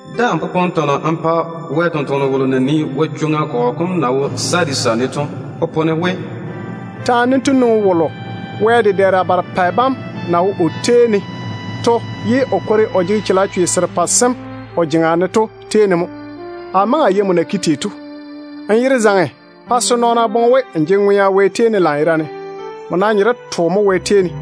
Daa‑n popone tɔnɔ n pa Wɛ tontoŋeno wolo na nii Yezu kɔgɔ kom na wo Sadisa ne to. Popone we: Taane dento nwoŋi wolo na tei Wɛ dedɛɛra barepɛ bam ye o kwori o jege chalechwe serepɛ sem o jeŋa ne to tei mo. Amo maŋe a yei abam na ke tei to. Abam yere zaŋe pa se nɔɔna boŋe we á jege ŋwea mo Wɛ tei ne, ye á nam nye de twa mo tei.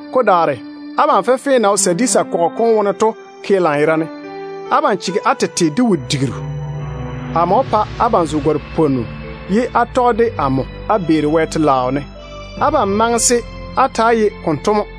Ko daare, abam fenfee na wo Sadisa kɔgɔ kom wone to ke lanyerane, de ba na chege ba tete de wo-digiru to. Amo wó pa ba zo gare-pwonnu ye ba taa tɔge de amo ba via, ba na maŋe se ba taa ye konto to ŋwaane.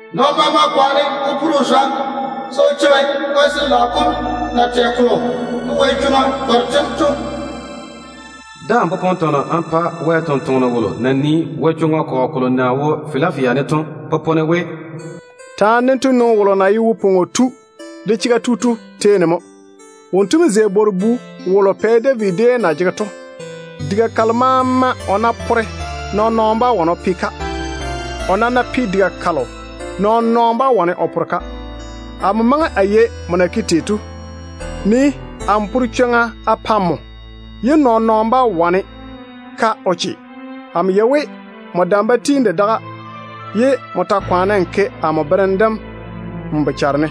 Nɔɔno maama kwaane o pore o zwa se o cheigi Wɛ Sin-laao kom na tɛ kolo de wɛ-di sem nɔɔna bam to. Daa‑n popone tɔnɔ n pa Wɛ tontoŋeno wolo na nii Yezu kɔgɔ kolo na wo Filafia ne to. Popone we: Taane dento nwoŋi wolo na ye wo-pwoŋo tu de chega tu to tei mo. Wonto mo zei Pɛ David bwor-bu. Diga kalo maama o ná pore, nɔɔn-nɔɔno bá wane o pe-ka. O nam ná pe diga kalo, nɔɔn-nɔɔno bá wane o pore-ka. Amo maŋe a yei abam na ke tei to. Nii-na! Amo pore chwoŋa a pa abam ye nɔɔn-nɔɔno bá wane-ka o che. Amo yei we abam dam ba tiini de daga, ye á ta kwaane á ke amo berem dem á bochare ne.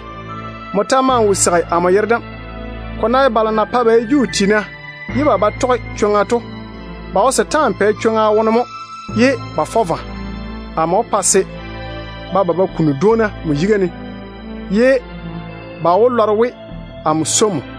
Á ta maa wo seigi amo yere dem. Ko ná ye balo na pae ba ye Juu tiina ye ba ba tɔge chwoŋa to, ba wo setaana pɛ chwoŋa wone mo ye ba fɔ vwa. Amo wó pa se ba ba ba kuni dwoona abam yiga ne. Ba maa wó maane we amo swoi abam.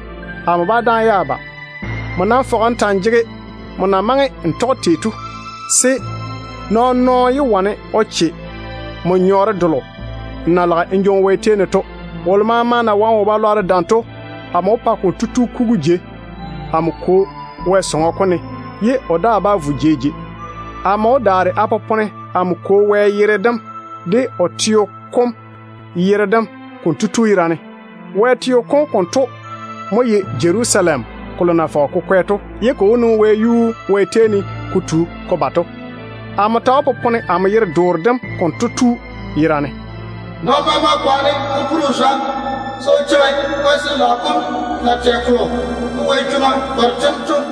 Amo bá dáane ye a ba. Abam nam fɔge á ta‑á jege á na maŋe á tɔge tei to, se nɔɔn-nɔɔno yé wane o che abam pɛɛre delo á na lage á jwoŋi Wɛ tei ne to. Wolo maama ná wane wo-balwaaro dam, amo wó pa konto tu na kugu jei amo Kwo Wɛ sɔŋɔ kom ne, ye o daa bá nwoŋi da maŋa de maŋa. Amo wó daare a popone amo Kwo Wɛ yere dem de o teo kom yere dem konto tu yera ne. Wɛ teo kom konto mo ye Jerusalem kolo na fɔge ko kwɛ to, ye amo Kwo Wɛ wó pa ko nwoŋi wɛyuu ne ko tu ko ba to. Amo ta wó popone amo yere-doore dem konto tu yera ne. Nɔɔno maama kwaane o pore o zwa se o cheigi Wɛ Sin-laao kom na tɛ kolo de wɛ-di sem nɔɔna bam to.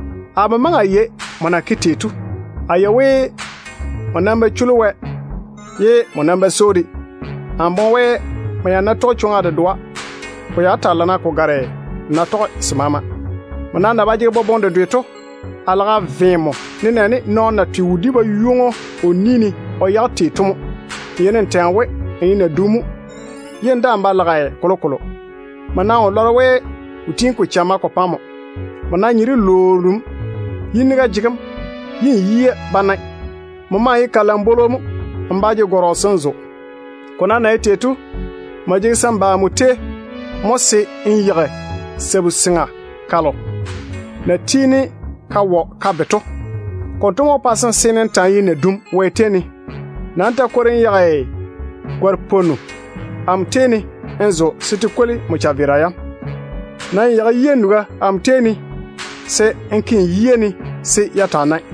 Amo maŋe a yei abam na ke tei to. A yei we abam ba chuli Wɛ, ye á nam ba swoi‑o de á wo maama de. Amo boŋe we, á ya ná tɔge chwoŋa dedoa, ko wó taa lana ko gare á ná tɔge se maama. Abam nam na ba jege boboŋe dedwe to, a lage a ve abam, nenɛɛne nɔɔno na twe wodi-baywoŋo o ni ne o yage tei to mo. Abam yeini á tɛ we, á ye naduna mo ye kolokolo wo muri abam. Á nam wo lɔre we yini-gwia mo jege abam. Á nye de lwoona mo, ye á yia ba nae. Á ta ye kalambwolo mo de. Abam nam jege se á ba amo tei mo, se á yeigi sabu-seŋa kalo ba na tiini ba wɔ mini ne pa ka be to. Konto mo wó pa se á seene á ta‑á ye naduna Wɛ yiga ne. Ba-na á yeigi gare-pwonnu de amo tei ne á zo se te kwoli á chaveera yam. Nam yeigi-na yia nuga amo tei ne se á ke á yia ne se ya taa nae.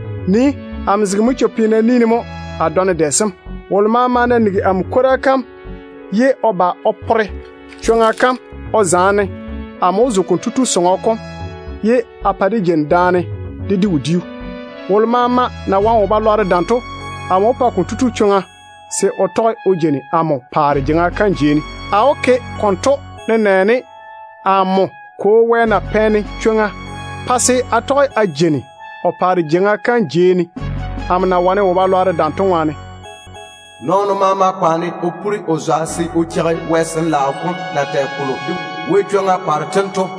Nii-na! Amo zege manchwo-peena ne mo a dɔne dɛ sem. Wolo nam ná nigi amo kwora kam ye o ba o pore chwoŋa o zaane-ne, amo wó zo konto tu tei, ye a pa dé jeini daane dé di wodiu. Wolo maama na wane wo-balwaaro dam to, amo wó pa konto tu chwoŋa se o tɔge o jeini amo paare jeiŋa kam jei ne, nenɛɛne amo de na tɔge a jeini a Kwo Wɛ paare jeiŋa kam jei ne tei, amo na wane wo-balwaaro dam to ŋwaane. Nɔɔno maama kwaane o pore o zwa se o cheigi Wɛ Sin-laao kom na tɛ kolo de wɛ-di sem nɔɔna bam to.”